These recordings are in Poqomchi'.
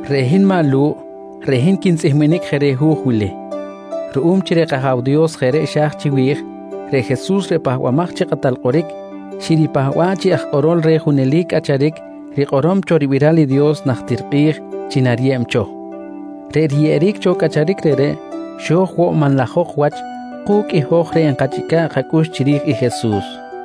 Reꞌ hin maꞌ Lu̱ꞌ, reꞌ hin quintzꞌihminic je reh hu̱j wili. Ruꞌum chi reꞌ kAja̱w Dios jeꞌ reꞌ xa̱j chiwi̱j, reꞌ Jesus reꞌ Pahbamaj chi Kꞌatal Kꞌoric xiripahba̱ꞌ chi aj kꞌorol reh junelic cꞌacharic rikꞌorom cho ribiral i Dios najtir kꞌi̱j chi nariyeb cho. Reꞌ riyeꞌeric cho cꞌacharic reꞌreꞌ xo̱j woꞌ manlajok wach ku̱cꞌ i hoj reꞌ nkachꞌica̱ꞌ kacꞌux chiri̱j i Jesus.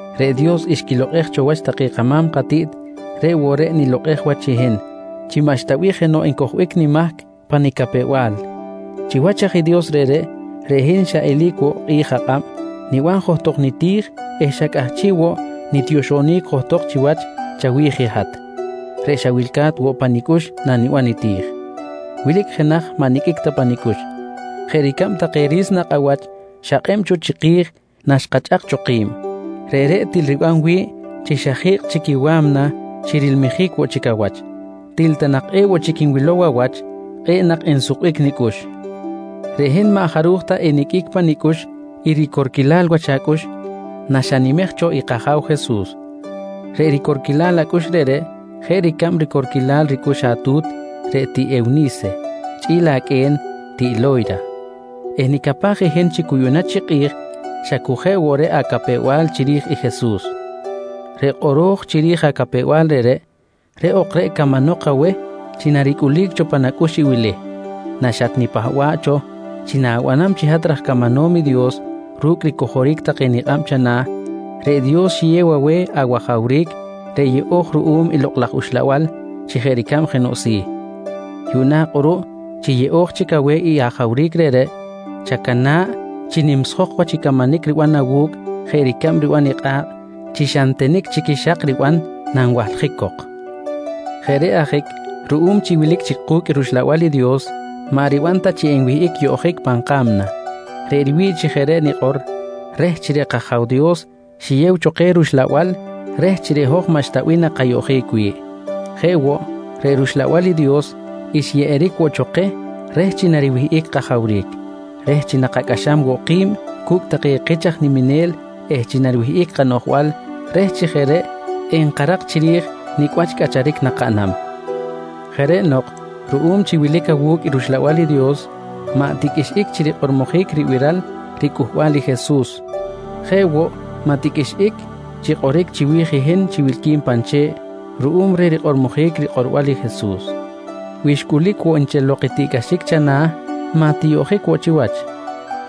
Reꞌ Dios xquilokꞌej cho wach take kama̱m katiꞌt reꞌ woꞌ reꞌ i nilokꞌej wach i hin chi maꞌxta bih jenoꞌ encojbic nimahc pa nicapew-bal. Chiwach aj i Dios reꞌreꞌ, reꞌ hin xa eli̱c woꞌ kꞌi̱j akꞌab niban johtok niti̱j eh xa cꞌahchiꞌ woꞌ nitioxonic johtok chiwach chawi̱j i hat reꞌ xa wilca̱t woꞌ pa nicꞌux naniban niti̱j. Wilic jenaj maꞌ niqꞌuic ta pa nicꞌux, jeꞌ ricab take ri̱s nakꞌ awach xakꞌeꞌb cho chiki̱j naxkachꞌak cho ki̱b. Reꞌreꞌ til riban wi̱ꞌ chi xa ji̱kꞌ chic i wa̱mna chi rilmijic woꞌ chic awach. Til ta nak ewoꞌ chic nwilow awach, kꞌe̱ꞌ nak ensukbic nicꞌux. Reꞌ hin maꞌ jaruj ta eniqꞌuic pa nicꞌux i ricorquilal wach acꞌux naxanimej cho i kAja̱w Jesus. Reꞌ ricorquilal acꞌux reꞌreꞌ jeꞌ ricab ricorquilal ricꞌux atu̱t reꞌ tiꞌ Ewni̱se chꞌi̱l aqꞌue̱n tiꞌ Lo̱yra eh nicapaj i hin chi cu yuꞌna chi kꞌi̱j xa cu jeꞌ woꞌ reꞌ acapew-bal chiri̱j i Jesus. Reꞌ kꞌoro̱j chiri̱j acapew-bal reꞌreꞌ, reꞌ ok reꞌ camanok aweh chi naricꞌulic cho pan acꞌux i wili: Naxatnipahba̱ꞌ cho chi na̱banam chi hat raj camanom i Dios ru̱cꞌ ricojoric take nikꞌab chana̱, reꞌ Dios xiyew aweh awajawric reꞌ yeꞌo̱j ruꞌum i Lokꞌ laj Uxlabal chi jeꞌ ricab jenoꞌ si̱. Yuꞌna kꞌuruꞌ chi yeꞌo̱j chic aweh i ajawric reꞌreꞌ, chacana̱ꞌ chi nimsjok wach i camanic riban awu̱cꞌ jeꞌ ricab riban i kꞌa̱kꞌ chi xa ntenic chic i xak riban nanwahljic cok. Jeꞌ reꞌ ajic ruꞌum chi wilic chic ku̱cꞌ rUxlabal i Dios maꞌ riban ta chi enwihꞌic yoꞌjic pan ka̱mna. Reꞌ riwi̱ꞌ chi jeꞌ reꞌ nikꞌor reh chi reꞌ kAja̱w Dios xiyew cho keh rUxlabal reh chi reꞌ hoj maꞌxta bih nakayoꞌjic wi̱ꞌ. Jeꞌ woꞌ, reꞌ rUxlabal i Dios xyeꞌeric woꞌ cho keh reh chi nariwihꞌic kajawric, reh chi nakacꞌaxam woꞌ ki̱b cu̱cꞌ take kich aj niminel eh chi nariwihꞌic kanoꞌjbal reh chi jeꞌ reꞌ nkarak chiri̱j nicꞌ wach cꞌacharic nakaꞌnam. Jeꞌ reꞌ nok ruꞌum chi wilic awu̱cꞌ rUxlabal i Dios maꞌ tiqꞌuixꞌic chi rikꞌormojic ribiral ricꞌuhbal i Jesus. Jeꞌ woꞌ, maꞌ tiqꞌuixꞌic chi kꞌoric chiwi̱j i hin chi wilqui̱n pan che̱ꞌ ruꞌum reh rikꞌormojic rikꞌorbal i Jesus. Wi xcꞌulic woꞌ nchel lok i tiꞌcꞌaxic chana̱, maꞌ tiyoꞌjic woꞌ chiwach,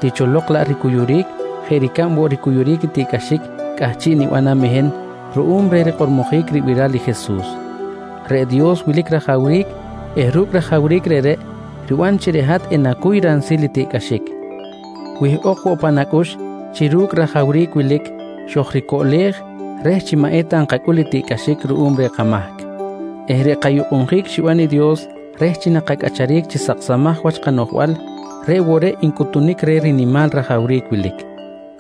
ticholok laꞌ ricuyuric jeꞌ woꞌ ricab ricuyuric tiꞌcꞌaxic cꞌahchiꞌ nibanam i hin ruꞌum reh rikꞌormojic ribiral i Jesus. Reꞌ Dios wilic rajawric eh ru̱cꞌ rajawric reꞌreꞌ riban chi reꞌ hat enacuy ransil i tiꞌcꞌaxic. Wihꞌok woꞌ pan acꞌux chi ru̱cꞌ i rajawric wilic xojricoꞌlej reh chi maꞌ eta nkacꞌul i tiꞌcꞌaxic ruꞌum reh kamahc eh reꞌ kayukꞌunjic xiban i Dios reh chi nakacꞌacharic chi saksamaj wach kanoꞌjbal, reꞌ woꞌ reꞌ ncꞌuhtunic reh rinimal rajawric wilic.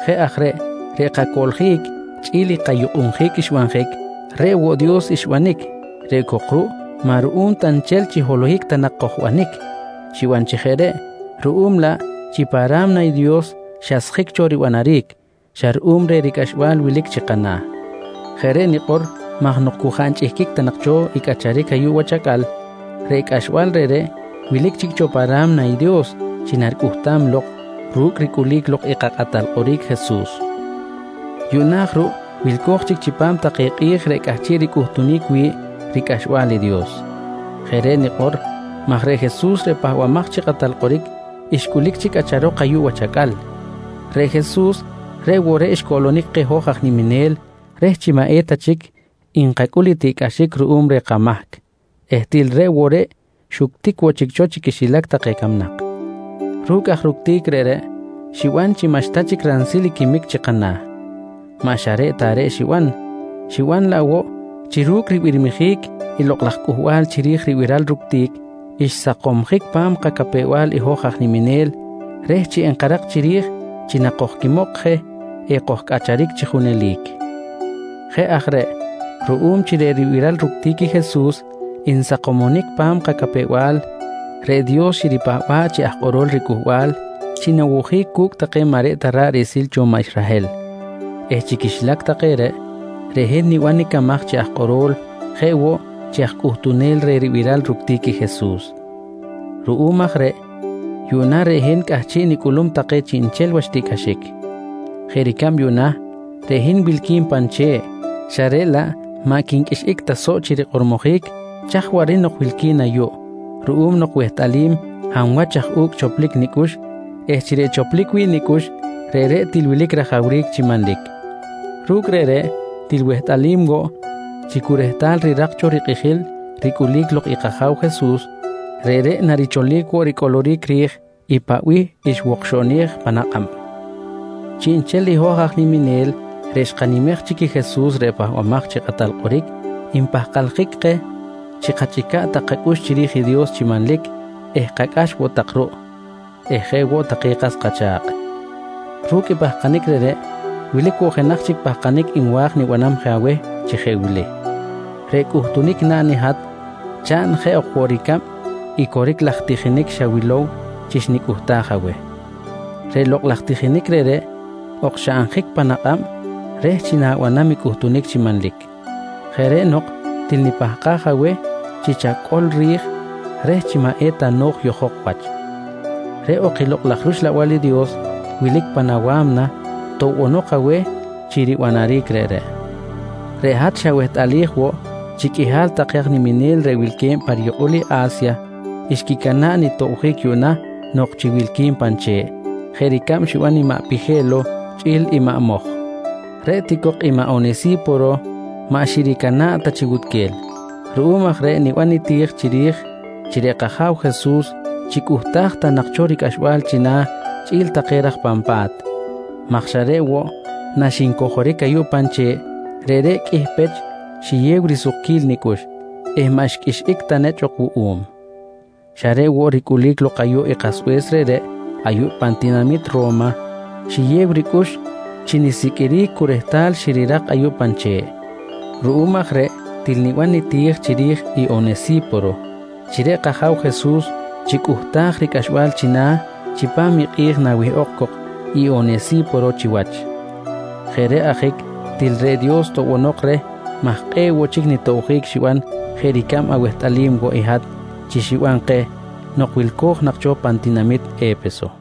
Jeꞌ aj reꞌ, reꞌ kacoꞌljic chꞌi̱l i kayukꞌunjic xbanjic, reꞌ woꞌ Dios xbanic, reꞌ cok ruꞌ maꞌ ruꞌum ta nchel chi holohic ta nak kojbanic xiban chi jeꞌ reꞌ ruꞌum laꞌ chi pa ra̱mna i Dios xasjic cho ribanaric xa ruꞌum reh ricꞌaxbal wilic chi kana̱. Jeꞌ reꞌ nikꞌor maj nok cu jaꞌ nchꞌihquic ta nak cho i cꞌacharic ayuꞌ wach acꞌal, reꞌ cꞌaxbal reꞌreꞌ wilic chic cho pa ra̱mna i Dios chi naricꞌuhtam lok ru̱cꞌ ricꞌulic lok i kaKꞌatal Kꞌoric Jesus. Yuꞌna aj ruꞌ wilco̱j chic chipam take kꞌi̱j reꞌ cꞌahchiꞌ ricꞌuhtunic wi̱ꞌ ricꞌaxbal i Dios. Jeꞌ reꞌ nikꞌor maj reꞌ Jesus reꞌ Pahbamaj chi Kꞌatal Kꞌoric, xcꞌulic chic cꞌacharok ayuꞌ wach acꞌal. Reꞌ Jesus, reꞌ woꞌ reꞌ xcoꞌlonic keh hoj aj niminel reh chi maꞌ eta chic nkacꞌul i tiꞌcꞌaxic ruꞌum reh kamahc eh til reꞌ woꞌ reꞌ xuctic woꞌ chic cho chi quixilac take camnak. Ru̱cꞌ aj ructic reꞌreꞌ, xiban chi maꞌxta chic ransil i quimic chi kana̱. Maꞌ xa reꞌ ta reꞌ xiban, xiban laꞌ woꞌ chi ru̱cꞌ ribirmijic i lokꞌ laj cꞌuhbal chiri̱j ribiral ructic, xsakomsjic pa̱m kacapew-bal i hoj aj niminel reh chi enkarak chiri̱j chi nakojquimok je ekojcꞌacharic chi junelic. Jeꞌ aj reꞌ ruꞌum chi reꞌ ribiral ructic i Jesus nsakomonic pan kacapew-bal, reꞌ Dios xiripahba̱ꞌ chi aj kꞌorol riCꞌuhbal chi nawojic cu̱cꞌ take maꞌ reꞌ ta ra̱ꞌ riꞌsil cho maꞌ Israhel eh chi quixilac take reꞌ, reꞌ hin niban nicamaj chi aj kꞌoro̱l jeꞌ woꞌ chi aj cꞌuhtunel reh ribiral ructic i Jesus. Ruꞌum aj reꞌ yuꞌna reꞌ hin cꞌahchiꞌ nicꞌulum take xa chiꞌnchel wach tiꞌcꞌaxic. Jeꞌ ricab yuꞌna reꞌ hin wilqui̱n pan che̱ꞌ, xa reꞌ laꞌ maꞌ quinqꞌuixꞌic ta soꞌ chi rikꞌormojic chaj waꞌric nok wilqui̱n ayuꞌ ruꞌum nok wehtꞌalim hab wach aj u̱cꞌ choplic nicꞌux eh chi reꞌ choplic wi̱ꞌ nicꞌux reꞌreꞌ til wilic rajawric chi manlic. Ru̱cꞌ reꞌreꞌ, til wehtꞌalim woꞌ chi cu rehtal rirak cho rikꞌijil ricꞌulic lok i kAja̱w Jesus, reꞌreꞌ naricholic woꞌ ricꞌoloric ri̱j i paꞌ bih xwokxoꞌnej pan kꞌab. Chiꞌnchel i hoj reꞌ xkanimej chic i Jesus reꞌ Pahbamaj chi Kꞌatal Kꞌoric npahkaljic keh chi kachꞌica̱ꞌ tak kacꞌux chiri̱j i Dios chi manlic eh kacꞌax woꞌ tak ruꞌ eh jeꞌ woꞌ take kas kacha̱kꞌ. Ru̱cꞌ i pahkanic reꞌreꞌ, wilic woꞌ jenaj chic pahkanic nwa̱j nibanam je aweh chi jeꞌ wili: Reꞌ cꞌuhtunic naꞌn i hat chaꞌn jeꞌ ok woꞌ ricab i coric laj tijinic xawilow chi xnicꞌuhtaj aweh. Reꞌ lokꞌ laj tijinic reꞌreꞌ, okxaꞌnjic pan akꞌab reh chi na̱banam i cꞌuhtunic chi manlic. Jeꞌ reꞌ nok til nipahkaj aweh chi chacꞌol ri̱j reh chi maꞌ eta no̱j yojok wach. Reꞌ ok i Lokꞌ laj rUxlabal i Dios wilic pan awa̱mna toꞌbonok aweh chi ribanaric reꞌreꞌ. Reꞌ hat xawehtꞌalij woꞌ chi qꞌuihal take aj niminel reꞌ wilque̱b pa riyukꞌul i A̱sya xquicana̱ꞌ nitobjic yuꞌna nok chi wilqui̱n pan che̱ꞌ jeꞌ ricab xiban i maꞌ Pije̱lo chꞌi̱l i maꞌ Moj. Reꞌ ti cok i maꞌ Onesi̱poro maꞌ xiricana̱ꞌ ta chi wutquel. Ruꞌum aj reꞌ niban niti̱j chiri̱j chi reꞌ kAja̱w Jesus chicꞌuhtaj ta nak cho ricꞌaxbal china̱ chꞌi̱l take raj pan pa̱t maj xa reꞌ woꞌ naxincojoric ayuꞌ pan che̱ꞌ, reꞌreꞌ qꞌuih pech xiyew risukquil nicꞌux eh maꞌ xqꞌuixꞌic ta nechꞌ ok wuꞌum. Xa reꞌ woꞌ ricꞌulic lok ayuꞌ i kasbe̱s reꞌreꞌ ayuꞌ pan tinamit Ro̱ma, xiyew ricꞌux chi nisiqꞌuiric cu rehtal xirirak ayuꞌ pan che̱ꞌ. Ruꞌum aj reꞌ til niban niti̱j chiri̱j i Onesi̱poro chi reꞌ kAja̱w Jesus chicꞌuhtaj ricꞌaxbal china̱ chipam i kꞌi̱j nawihꞌok cok i Onesi̱poro chiwach. Jeꞌ reꞌ ajic til reꞌ Dios toꞌbonok reh maj kꞌe̱ꞌ woꞌ chic nitobjic xiban jeꞌ ricab awehtꞌalim woꞌ i hat chi xiban keh nok wilco̱j nak cho pan tinamit E̱peso.